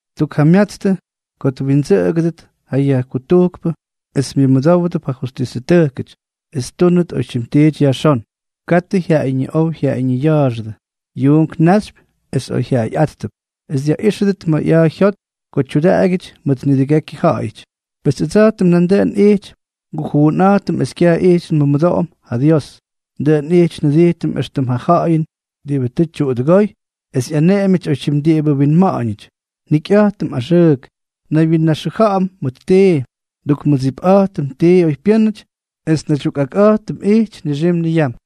Tukjamyatstʉ ko twindsʉꞌʉgʉdʉt ja yajkutujkpʉ es myʉmʉdówdʉp ja justisʉtʉjkʉty, es ttúnʉt oytyim tiity yajxón, katʉ jyaꞌayñiꞌow jyaꞌayñiya̱a̱xʉdʉ, yuunk naxypy es oyjyaꞌayꞌáttʉp, es dyaꞌíxʉdʉt ma̱ ꞌya̱a̱ jyot ko tyudaꞌagyʉty mʉt nidʉgekyʉ ja̱ꞌa̱yʉty. Pes ʉdsa̱jtʉm nandʉꞌʉn ijty ngujuunꞌa̱jtʉm es kyaj ijty nmʉmʉdoꞌom ja Dios. Dʉꞌʉn ijty njʉdijtʉm éxtʉm ja ja̱ꞌa̱yʉn diꞌibʉ tʉ tyuꞌudʉgóy es ꞌyaneꞌemyʉty oytyim diꞌibʉ winma̱ꞌa̱ñʉty, njikyꞌa̱jtʉm axʉʉk, nnaywyinnaxʉja̱ꞌa̱m mʉt tii, ndukmʉdsipꞌa̱jtʉm tii oypyʉ́nʉty es nnaydyukꞌakꞌa̱jtʉm ijty nixim niyam.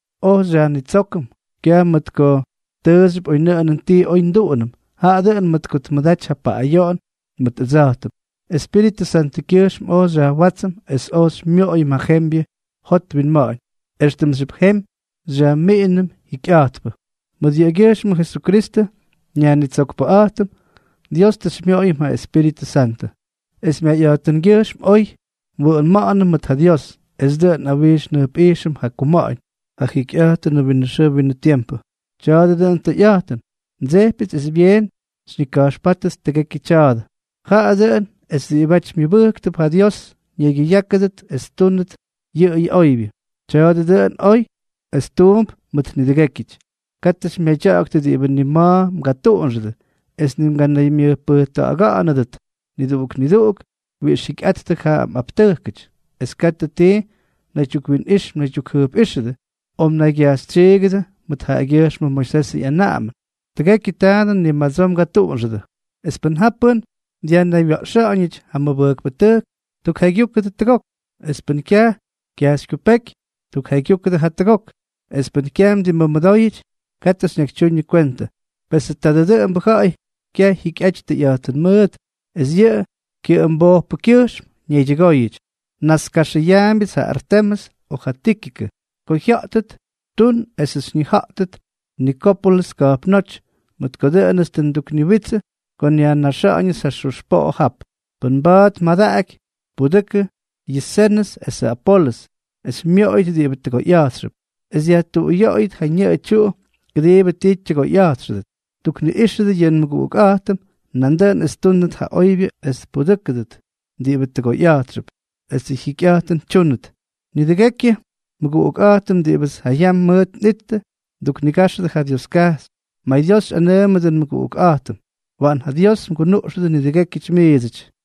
oj xyajnitsókʉm, kyaj mʉt ko tʉʉxyʉp oynʉꞌʉnʉn ti oy nduꞌunʉm, jaꞌa dʉꞌʉn mʉt ko tmʉdaty ja paꞌꞌayoꞌon mʉt ʉdsa̱jtʉm, Espíritʉ Santʉkyʉjxm oj xyajwátsʉm es oj xymyoꞌoyʉm ja jembyʉ jot winma̱ꞌa̱ñ, éxtʉmxyʉp jemy xyajmiꞌinʉm jikyꞌa̱jtpʉ. Mʉt yʉꞌʉgyʉjxmʉ Jesukristʉ, nYajnitsokpʉꞌa̱jtʉm, Dios tʉ xymyoꞌoyʉm ja Espíritʉ Santʉ, es myayꞌa̱jtʉngyʉjxm oy nwʉꞌʉma̱ꞌa̱nʉm mʉt ja Dios, es dʉꞌʉn nꞌawijx njʉjpꞌijxʉm ja kuma̱ꞌa̱ñ, ja jikyꞌa̱jtʉnʉ winʉ xʉʉ winʉ tiempʉ. Tya̱a̱dʉ dʉꞌʉn tʉyꞌa̱jtʉn, ndsejpyʉts es byeen xyñika̱jxpátʉt tʉgekyʉ tya̱a̱dʉ, jaꞌa dʉꞌʉn es diꞌibáty myʉbʉjktʉp ja Dios ñaygyʉyákʉdʉt es ttúnʉt yʉꞌʉyʉ oybyʉ. Tya̱a̱dʉ dʉꞌʉn oy es tuump mʉt nidʉgékyʉty. Katʉ xymyadya̱ꞌa̱ktʉ diꞌibʉ ni ma̱ mgatuꞌunxʉdʉ, es ni mganaymyʉjpʉjta̱ꞌa̱ga̱ꞌa̱nʉdʉt niduꞌuk niduꞌuk wiꞌix jyikyꞌa̱jttʉ ja mꞌaptʉjkʉty, es katʉ ti mnaydyukwinꞌix mnaydyukjʉjpꞌíxʉdʉ o mnaygyajxytsyiigʉdʉ mʉt jaꞌagyʉjxmʉ Moisesʉ ꞌyanaꞌamʉn. Tʉgekyʉ taadʉ ni madsoo mgatuꞌunxʉdʉ. Es pʉn ja pʉ́n dyajnaywya̱ꞌxa̱ꞌa̱ñʉty ja mʉbʉjkpʉtʉjk, tukjaygyukʉ tʉgok, es pʉn kyaj kyajxykyupéky, tukjaygyukʉ jatʉgok; es pʉ́n kyaj mdimmʉmʉdóyʉty, katʉ xyñakytyuñʉ kwentʉ. Pesʉ tadʉ dʉꞌʉmbʉ ja̱ꞌa̱y kyaj jyikyꞌaty tʉyꞌa̱jtʉn mʉʉt, es yʉ kyʉꞌʉmbojpʉkyʉjxm ñaydyʉgóyʉty. Naskaxʉyaambyʉts ja Artemʉs o ja Tíkikʉ. Ko jya̱ꞌtʉt, tun esʉts xyñija̱ꞌtʉt Nikópolʉs ka̱jpnóty, mʉt ko dʉꞌʉnʉts tʉ ndukniwitsʉ ko nyajnaxa̱ꞌa̱ñʉts ja xux poꞌo jap. Pʉn maba̱a̱t mmadaꞌaky, pudʉkʉ yʉ Zenʉs esʉ Apolʉs, es xymyoꞌoyʉt diꞌibʉ tʉgoyꞌa̱jtxʉp, es dyajtuꞌuyoꞌoyʉt ja ñʉꞌʉ tyuꞌu kʉdiibʉ ti tyʉgoyꞌa̱jtxʉdʉt. Tukniꞌíxʉdʉ yʉ nmʉguꞌukꞌa̱jtʉm nandʉꞌʉn es ttúndʉt ja oybyʉ es tpudʉ́kʉdʉt diꞌibʉ tʉgoyꞌa̱jtxʉp, esʉ jyikyꞌa̱jtʉn tyúnʉt. Nidʉgekyʉ nmʉguꞌukꞌa̱jtʉm diꞌibʉts ja yam mʉʉt nꞌittʉ, mduknigáxʉdʉ ja Dioskajxy. MayDios xyꞌanʉʉmʉdʉ nmʉguꞌuktʉjkꞌa̱jtʉm. Waꞌan ja Dios mgunuꞌxʉdʉ nidʉgékyʉty miidsʉty.